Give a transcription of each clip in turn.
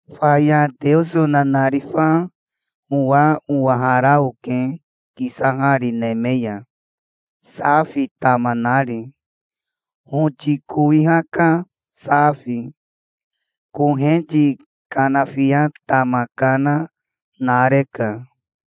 Faya Teoso nanarifa owa owahara oke kisahari neme ya, safi tama nari, hoti kowiha ka safi. Koheti kanafia tama kana nareka.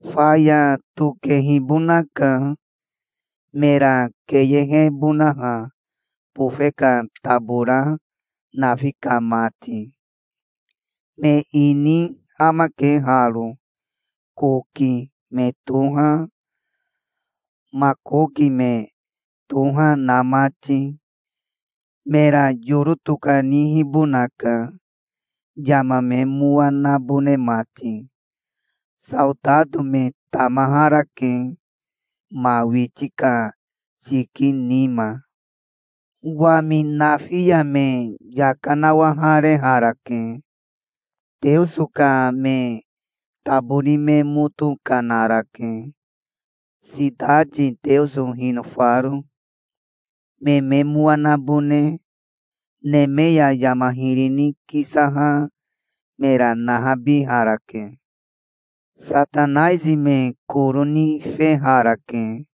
Faya tokehibonaka, mera keyehebonaha bofe ka tabora nafi ka mati. Me ini amake haro, Koki me toha, Makoki me toha na mati. Mera yoro tokanihibonaka, yama me mowa nabone mati. Saotato me tamaharake, ma witi ka siki nima. Wami nafi ya me yaka nawahareharake. Teoso ka me tabori me moto kanarake, sitati Teoso hinofaro. Me me mowa nabone neme ya yama hiri ni kisaha mera nahabiharake. Satanaisi me koro nifeharake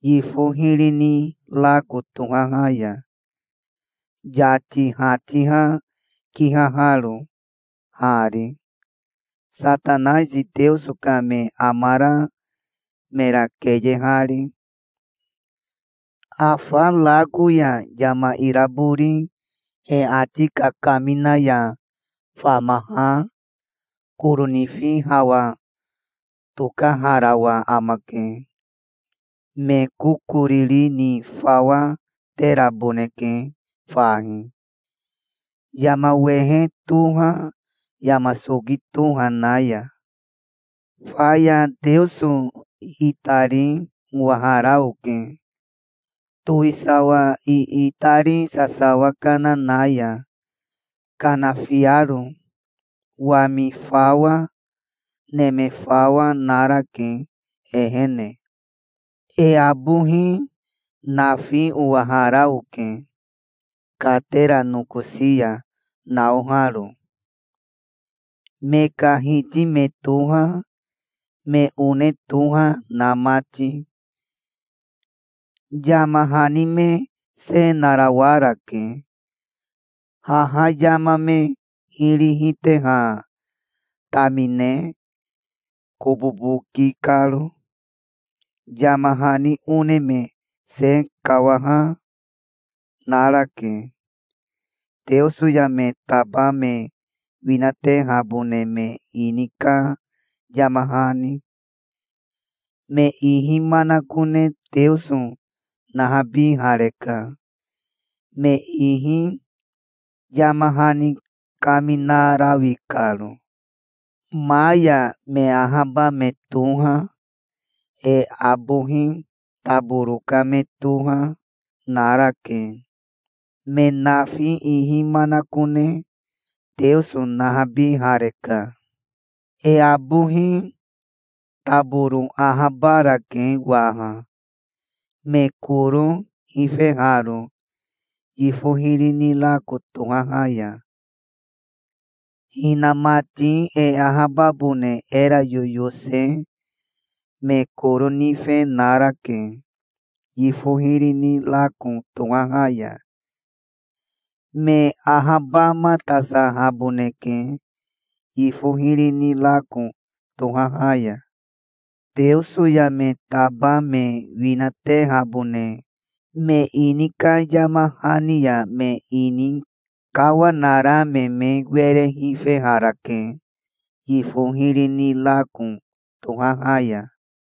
yifo hiri ni rako tohaha ya, yati hatiha kihaharo, hari, Satanaisi Teoso ka me amara mera keyehari. Afa rako ya yama irabori he ati kakamina ya famaha koro nifi hawa tokaharawa amake. Me kokoriri ni fawa teraboneke fahi, yama wehe toha, yama soki toha na ya. Faya Teoso itari owahara oke, towisawa iitari sasawa kana na ya, kanafiaro. Wami fawa, neme fawa, narake, ehene. E abohi nafi owahara oke katera nokosi ya naoharo, me ka hiti me toha, me one toha na mati. Yama hani me se narawarake, haha yama me hiri hiteha tamine kobobo ki karo. Yama hani one me se kawaha narake, Teoso ya me taba me winatehabone me ini ka yama hani. Me ihi manakone Teoso nahabihareka, me ihi yama hani kaminarawi karo. Ma ya me ahaba me toha, e abohi taboro ka me toha, narake. Me nafi ihi manakone Teoso nahabihareka. E abohi taboro ahabarake waha, me koro hifeharo yifo hiri ni rako tohaha ya. Hinamati e ahababone era yoyose me koro nife narake, yifo hiri ni rako tohaha ya. Me ahabamatasahaboneke, yifo hiri ni rako tohaha ya. Teoso ya me taba me winatehabone me ini ka yama hani ya me ini kawanara me me were nifeharake, yifo hiri ni rako tohaha ya.